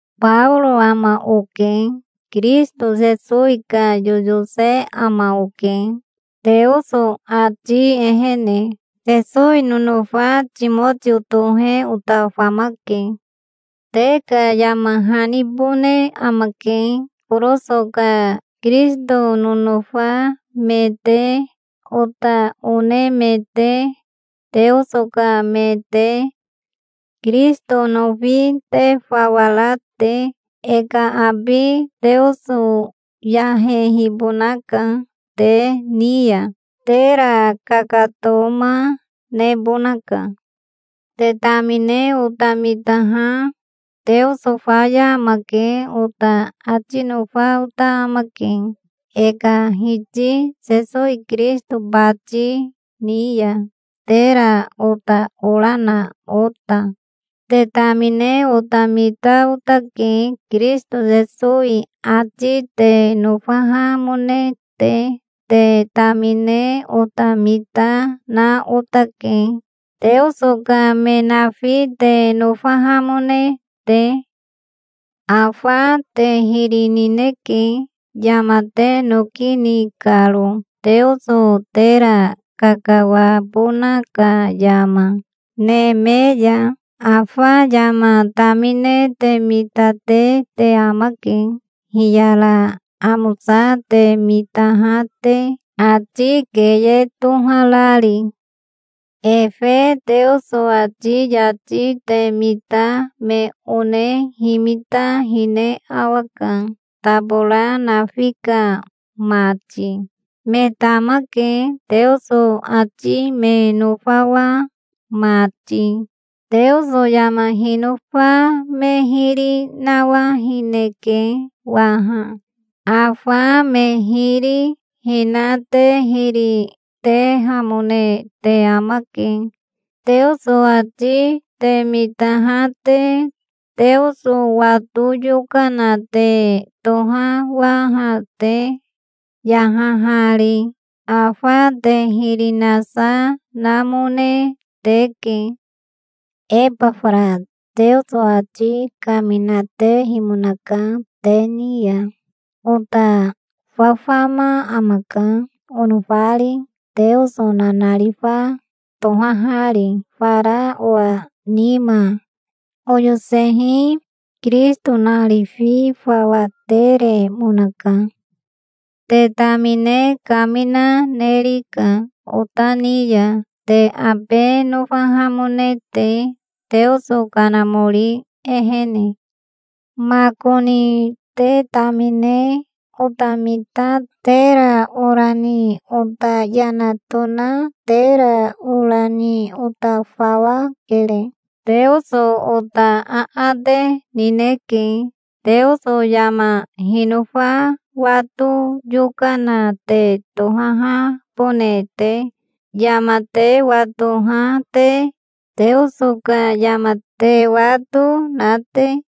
Baoro ama oke. Kirisito Sesowi ka yoyose ama oke, Teoso ati ehene. Sesowi nonofa Timotio tohe ota famake. Te ka yama hanibone amake, Koroso ka Kirisito nonofa me te, ota one me te, Teoso ka me te, Kirisito nofi te fawa ra te. E ka abi Teoso yahehibonaka te ni ya. Tera kakatoma nebonaka. Te tamine ota mitaha, "Teoso faya amake", ota ati nofa ota amake, e ka Hiti Sesowi Kirisito bati ni ya, tera ota ora na ota. Te tamine ota mita otake, Kirisito Sesowi ati te nofahamone te. Te tamine ota mita na otake, Teoso ka me nafi te nofahamone te. Afa te hiri nineke, yama te noki ni karo, Teoso tera kakawabona ka yama, neme ya. Afa yama tamine te mitate te amake, hiyara amosa te mitaha te, ati keye toharari. Efe Teoso ati yati te mita me one himita hine awaka, tabora nafi ka mati. Me tamake, Teoso ati me nofawa mati. Teoso yama hinofa me hiri nawahineke waha. Afa me hiri hina te hiri, tehamone te amake, Teoso ati te mitaha te, Teoso wato yokana te tohawaha te, yahahari. Afa te hiri nasa namone teke. Ebafara Teoso ati kaminatehimonaka te ni ya. Ota fafama amaka, onofari, Teoso nanarifa tohahari fara owa nima. Oyosehi Kirisito narifi fawa teremonaka. Te tamine kamina nerika ota ni ya, te abe nofahamone te, Teoso Kanamori ehene. Makoni te tamine ota mita tera ora ni ota yana tona tera ora ni ota fawa kere. Teoso ota aate nineke, Teoso yama hinofa wato yokana te tohahabone te, yama te watoha te, Teoso ka yama te wato na te.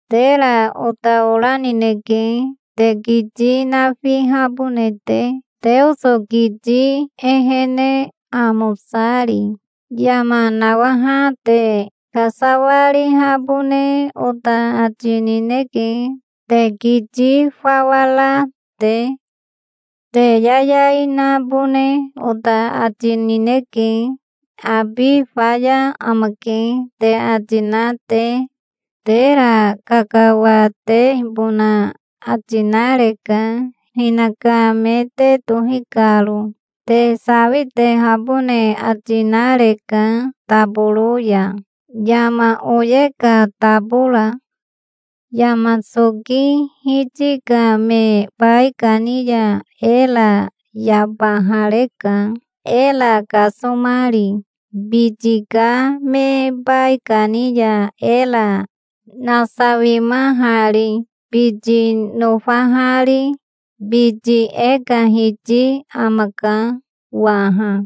Tera ota ora nineke, te kiti nafihabone te, Teoso kiti ehene, amosari. Yama nawaha te kasawarihabone ota ati nineke, te kiti fawa ra te. Te yayai nabone ota ati nineke, "Abi faya amake", te ati na te. Tera kakawatehibona ati nareka, hinaka me te tohi karo. Te sawitehabone ati nareka taboro ya, yama oye ka tabora. Yama soki hiti ka me baikani ya era yabahareka, era kasomari, biti ka me baikani ya era nasawimahari, biti nofahari. Biti e ka Hiti amaka waha.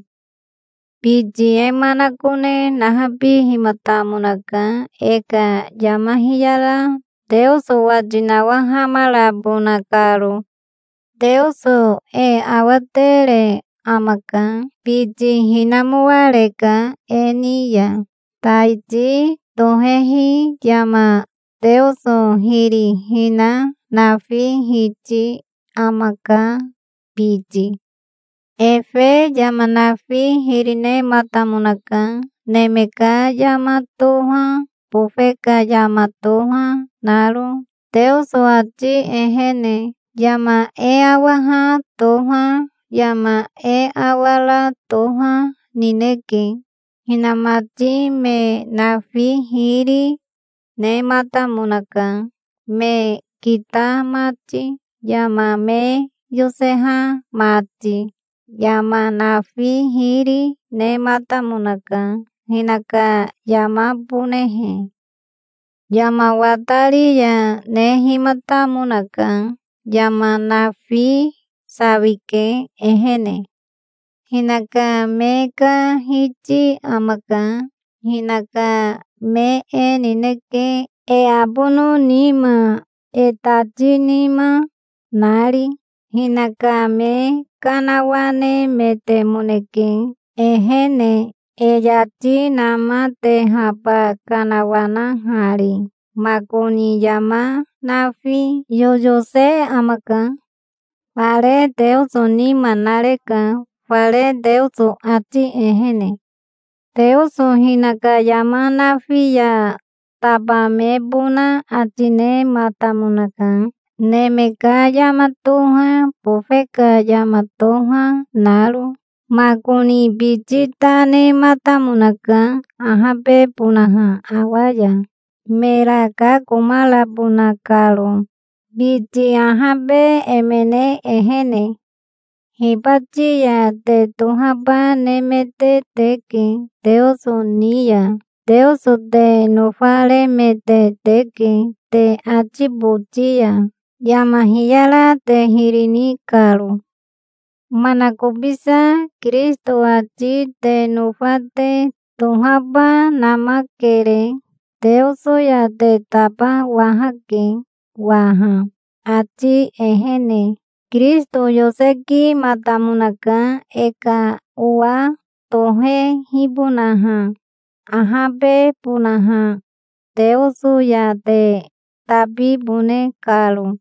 Biti e manakone nahabihimatamonaka, e ka yama hiyara Teoso wati nawahamarabona karo. Teoso e awatere amaka. Biti hinamoareka e ni ya. Taiti tohehi yama Teoso hiri hina nafi hiti amaka, biti. Efe yama nafi hiri nematamonaka, neme ka yama toha, bofe ka yama toha naro, Teoso ati ehene. Yama e awaha toha, yama e awara toha nineke. Hinamati me nafi hiri, nematamonaka, me kita mati, yama me yoseha mati. Yama nafi hiri nematamonaka, hinaka yamabonehe. Yama watari ya nehimatamonaka. Yama nafi sawike, ehene. Hinaka me ka Hiti amaka. Hinaka me e nineke, e abono nima, e tati nima nari. Hinaka me kanawanemetemoneke ehene, e yati namatehaba kanawanahari. Makoni yama nafi yoyose amaka. Fare Teoso nima nareka, fare Teoso ati ehene. Teoso hinaka yama nafi ya tabamebona ati nematamonaka, neme ka yama toha, bofe ka yama toha naro. Makoni biti ta nematamonaka, ahabebonaha awa ya, mera kakomarabona karo, biti ahabe emene ehene. Hibati ya te tohaba nemete teke Teoso ni ya. Teoso te nofaremete teke te ati boti ya, yama hiyara te hiri ni karo. Manakobisa Kirisito ati te nofa te tohaba namakere. Teoso ya te tabawahake waha, ati ehene. Kirisito yosekimatamonaka, e ka owa tohehibonaha, ahabebonaha, Teoso ya te tabibone karo.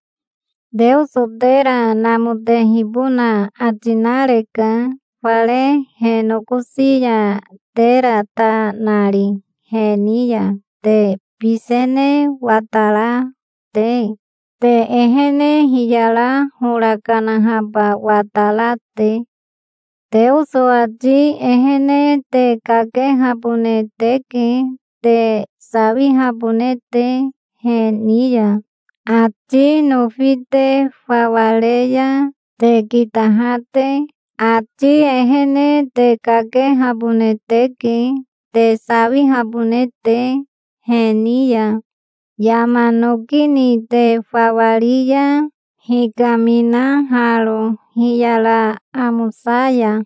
Teoso tera namotehibona ati nareka fare he nokosi ya, tera ta nari he ni ya, te bisene watara te, te ehene hiyara hora kanahaba watara te. Teoso ati ehene te kakehabone teke te sawihabone te he ni ya, ati nofi te fawa re ya, te kitaha te. Ati ehene te kakehabone teke te sawihabone te he ni ya, yama noki ni te fawa ri ya, hikaminaharo hiyara amosa ya.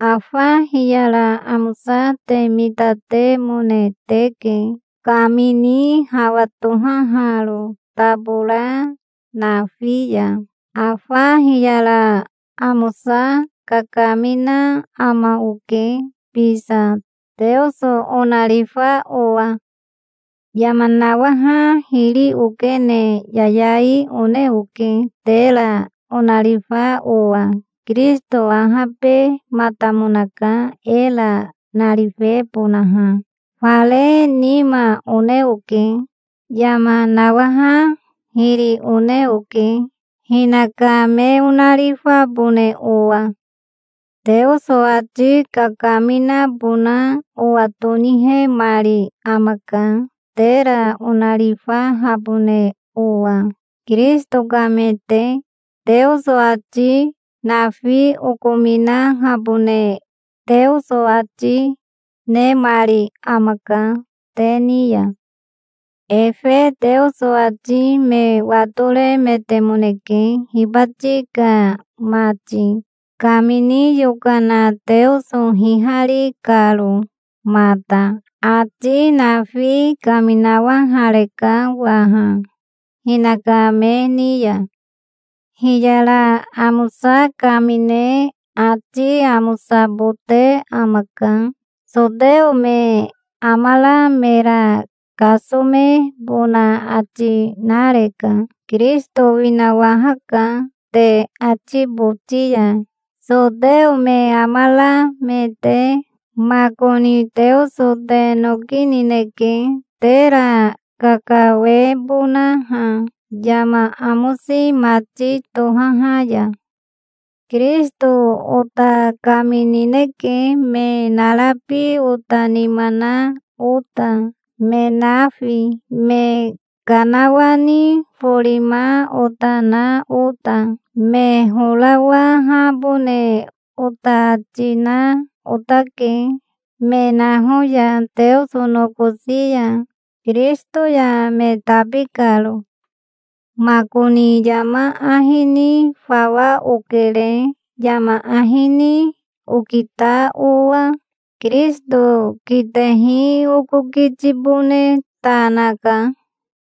Afa hiyara amosa te mitatemone teke, kamini hawa tohaharo tabora nafi ya. Afa hiyara amosa kakamina ama oke bisa, Teoso onarifa owa. Yama nawaha hiri okene yayai one oke, tera onarifa owa. Kirisito ahabematamonaka, era narifebonaha. Fare nima one oke. Yama nawaha hiri one oke, hinaka me onarifabone owa. Teoso ati kakaminabona owa tonihemari amaka, tera onarifahabone owa, Kirisito ka me te. Teoso ati nafi okominahabone Teoso ati nemari amaka te ni ya. Efe Teoso ati me watoremetemoneke, hibati ka mati, kamini yokana Teoso hihari karo mata. Ati nafi kaminawahareka waha hinaka me ni ya. Hiyara amosa kamine ati amosabote amaka. Soteo me amara mera kasomebona ati nareka. Kirisito winawahaka te ati boti ya, soteo me amara me te. Makoni Teoso te noki nineke, tera kakawebonaha yama amosi mati tohaha ya. Kirisito ota kaminineke me narabi ota nima na ota, me nafi, me kanawani forima ota na ota. Me horawahabone ota ati na otake, me naho ya Teoso nokosi ya, Kirisito ya me tabi karo. Makoni yama ahi ni fawa okere, yama ahi ni okita owa. Kirisito kitehi oko kitibone ta naka.